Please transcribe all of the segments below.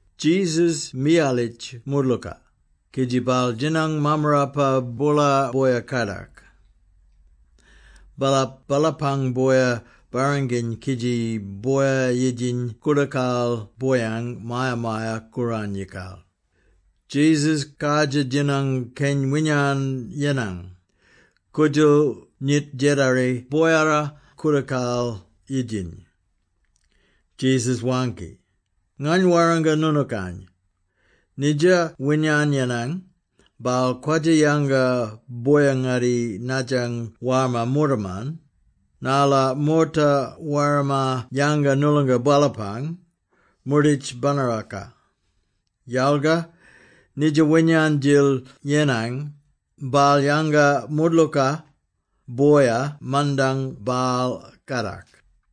Jesus miyalitj moodlooka, kidji baal djinang mammarapa boola boya-kadak. Baalap baalapang boya barranginy kidji boya yidjiny koodakal boyang Maya-maya-Kooranyikal, Jesus kardjir djinang keny winyan yenang, koodjal nyit djedari boyara koodakal yidjiny. Jesus waangki, “Ngany warranga noonookany, nidja winyan yenang, baal kwadja yanga boya-ngatti nadjang warma moortaman, narla moorta warma yanga noolonga baalapang moorditj banaraka; yalga nidja winyan-djil yenang, baal yanga moodlooka, boya mandang baal kadak.”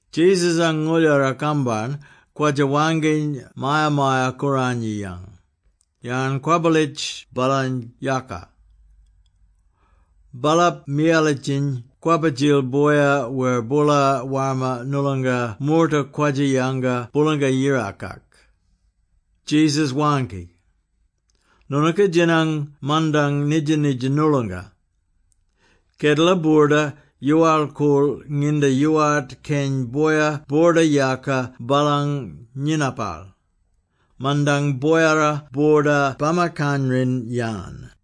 Jesus-ang ngooldjara-kambarn kwadja-waangkiny Maya-maya-Kooranyiyang, yarn kwabbalitj baalany yaaka. Baalap miyalitjiny kwabba-djil boya wer boola warma noolonga moorta kwadja-yanga Boolanga-Yirakak. Jesus waangki, “Noonooka djinang mandang nidja-nidja noolonga. Kedela boorda yoowal-koorl nginda yoowart keny boya boorda-yaaka baalang nyinapal; mandang boyara boorda bamakanrin-yan.”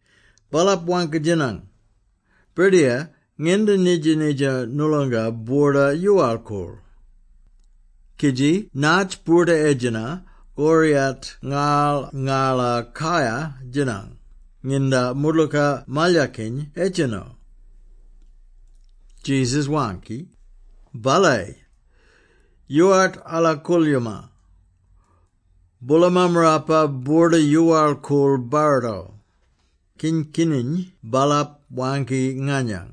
Baalap waangki-djinang, “Birdiyar, nginda nidja-nidja noolonga boorda-yoowal-koorl? Kidji natj boorda-edjena koriyat ngarl ngala kayar-djinang nginda moodlooka malyakiny edjeno?” Jesus waangki, “Balayi! Yoowart ala koolyooma. Boola mammarapa boorda-yoowal-koorl barrito, kin-kininy baalap waangki nganyang,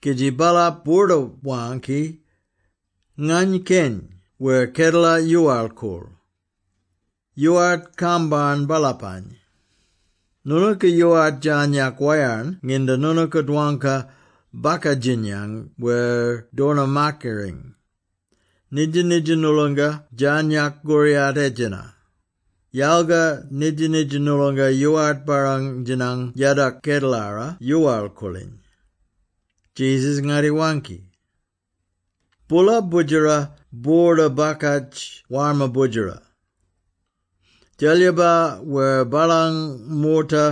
kidji baalap boorda-waangki, ‘Ngany Keny!’ wer ‘Kedela yoowal-koorl!’ Yoowart kambarn baalapany! Noonooka yoowart djarnyak wayarn nginda noonooka dwangka bakadjinyang wer dornamakariny. Nidja-nidja noolonga djarnyak koriyat edjena; yalga nidja-nidja noolonga yoowart barrang-djinang yadok kedelara yoowal-koorliny.” Jesus ngatti-waangki. “Boola boodjera boorda bakadj warma boodjera. Djelyiba wer baalang moorta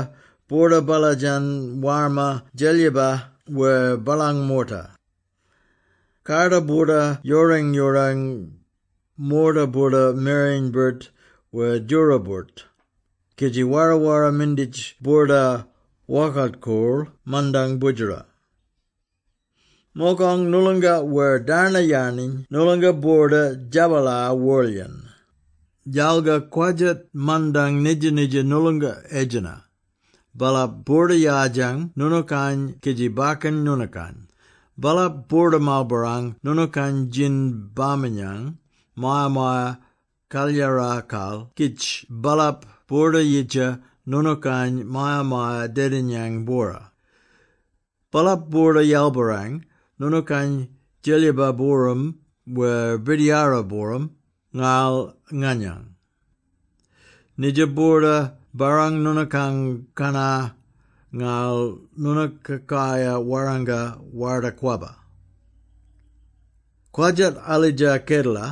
boorda-baladjan warma djelyiba wer baalang moorta. Karda boorda-yoorang-yoorang, moorta boorda mereny-birt wer djora-birt, kidji wara-wara minditj boorda-wokart-koorl mandang boodjera. Mogong noolonga wer darnayaniny noolonga boorda-djabalar worlyen. Yalga kwadjat mandang nidja-nidja noolonga edjena, baalap boorda-yardjang noonookany kidji bakkan noonookany; baalap boorda-marlbarrang noonookany djin-baminyang Maya-maya-Kalyarakal kidj baalap boorda-yidja noonookany maya-maya-dedinyang bwora. Baalap boorda-yalbarrang noonookany djelyiba-booram wer birdiyara-booram ngarl nganyang. Nidja boorda barrang noonookang kannar, ngarl noonooka kayar warranga Warda-Kwabba. Kwadjat alidja kedela,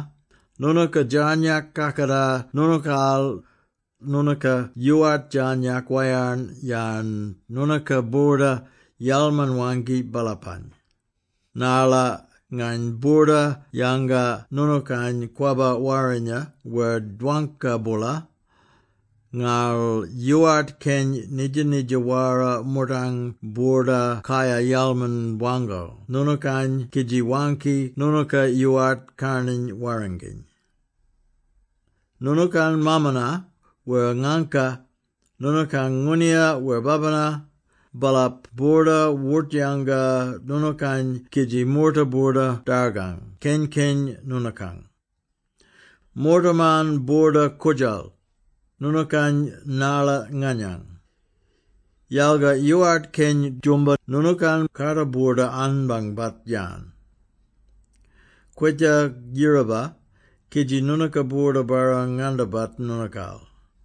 noonooka djarnyak kakatar noonookaal, noonooka yoowart djarnyak wayarn yarn noonooka boorda yalman-waangki baalapany, narla ngany boorda yanga noonookany kwabba warrinya wer dwangka-boola, ngarl yoowart keny nidja-nidja wara moortang boorda kayar yalman-waangko noonookany kidji waangki noonooka yoowart karnany warranginy. Noonookang maamana wer ngaangka, noonookang ngooniya wer babina, baalap boorda wort-yanga noonookany kidji moorta boorda-dargang keny-keny noonookang. Moortaman boorda koort-djal noonookany narla nganyang. Yalga yoowart keny djoomba noonookang kaata boorda-anbangbat-yan. Kwitjar yiraba, kidji noonooka boorda-barrang-ngandabat noonookaal.”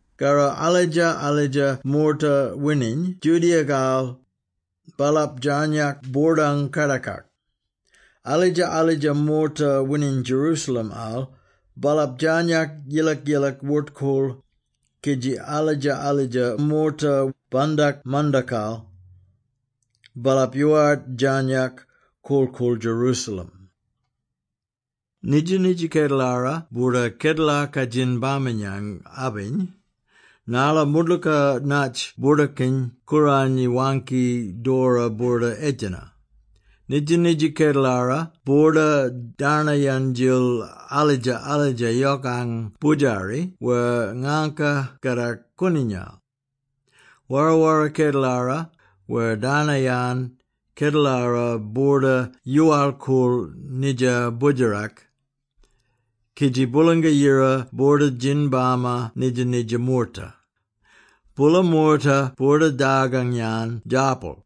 Karro alidja-alidja moorta wining Judea-kal, baalap djarnyak boordang kardakak; alidja-alidja moorta wining Jerusalem-al, baalap djarnyak yilak-yilak wort-koorl, kidji alidja-alidja moorta bandak mandakal, baalap yoowart djarnyak korl-koorl Jerusalem. Nidja-nidja kedelara boorda ‘Kedelaka Djin-baminyang’-abiny, narla moodlooka natj Boordakiny-Kooranyi waangki doora boorda edjena. Nidja-nidja Kedelara boorda darnayan-djil alidja-alidja yokang boodjari wer ngaangka kadak kooninya! Wara-wara kedelara wer darnayan kedelara boorda yoowal-koorl nidja boodjerak, kidji Boolanga-Yira boorda djin-bama nidja-nidja moorta. Boola moorta boorda dargang-yan djarpal;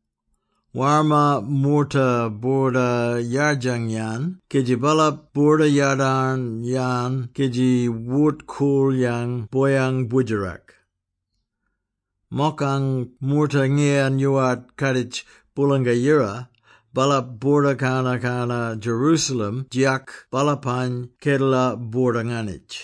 warma moorta boorda yardjang-yan kidji baalap boorda yadarn-yan kidji wort-kool-yan boyang boodjerak. Mokang moorta ngiyan yoowart kaaditj Boolanga-Yira, baalap boorda-kana-kana Jerusalem djiyak baalapang kedela boorda-nganitj.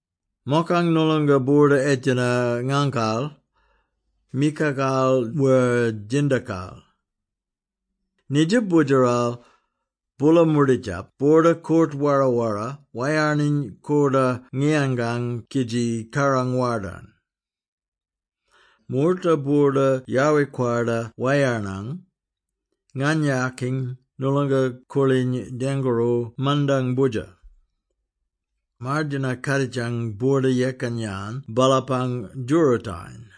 “Mokang noolonga boorda edjena ngangkal, mikakal wer djindakal. Nidja boodjeral, boola moorditjap boorda-koort-wara-wara, wayarniny koordor ngiyangang kidji kaarang wardarn. Moorta boorda yowi-kwarda wayarnang, nganayakiny noolonga koorliny dengkooro mandang Boodjer. Mardayina kadjitang boorda-yekan-yan baalapang djoorootayen.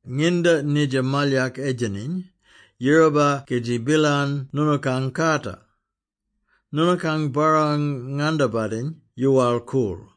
Nginda nidja malyak edjeniny, yiraba kidji billan noonookang kaata. Noonookang barrang-ngandabatiny yoowal-koorl.”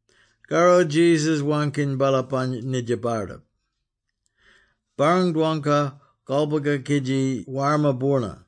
Karro Jesus waangki baalapany nidja bardip, “Barrang-dwangka kolboga kidji warma boorna.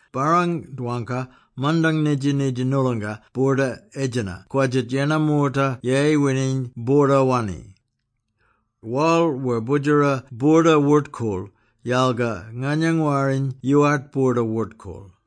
“Barrang-dwangka, mandang nidja-nidja noolonga boorda edjena kwadjat yennar moorta yeyi wining boorda-wanni. Worl wer Boodjara boorda wort-koorl, yalga nganyang Warriny yoowart boorda wort-koorl.”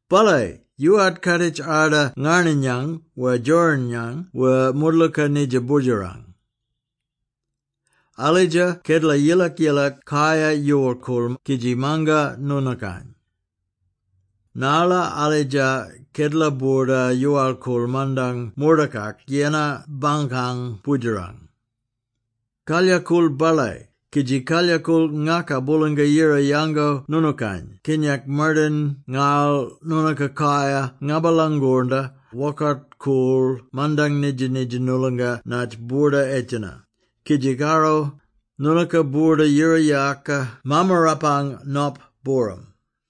“Balayi! Yoowart kaaditj arda ngarninyang wer djorinyang wer moodlooka nidja Boodjerang. Alidja kedela yilak-yilak kayar yoowal-koorl kidji manga noonookany! Narla alidja kedela boorda yoowal-koorl mandang moortakak yennar bankang Boodjerang. Kalyakool balayi kidji kalyakool ngakaka Boolanga-Yira yango noonookany kinyak mardayin ngarl noonooka kayar ngabalangornda wokart-koorl mandang nidja-nidja noolonga natj boorda edjena, kidji karro, noonooka boorda yira-yaaka Mammarapang Nop booram.”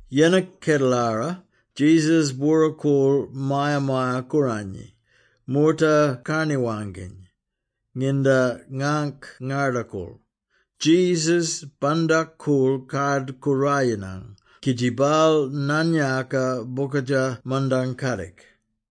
Yennar kedelara, Jesus bwora-koorl Maya-maya-Kooranyi, moorta karni-waangkiny. Nginda ngangk ngarda-koorl, Jesus bandak-koorl Kard-Koorayinang kidji baal naan-yaaka bokadja mandang kadik.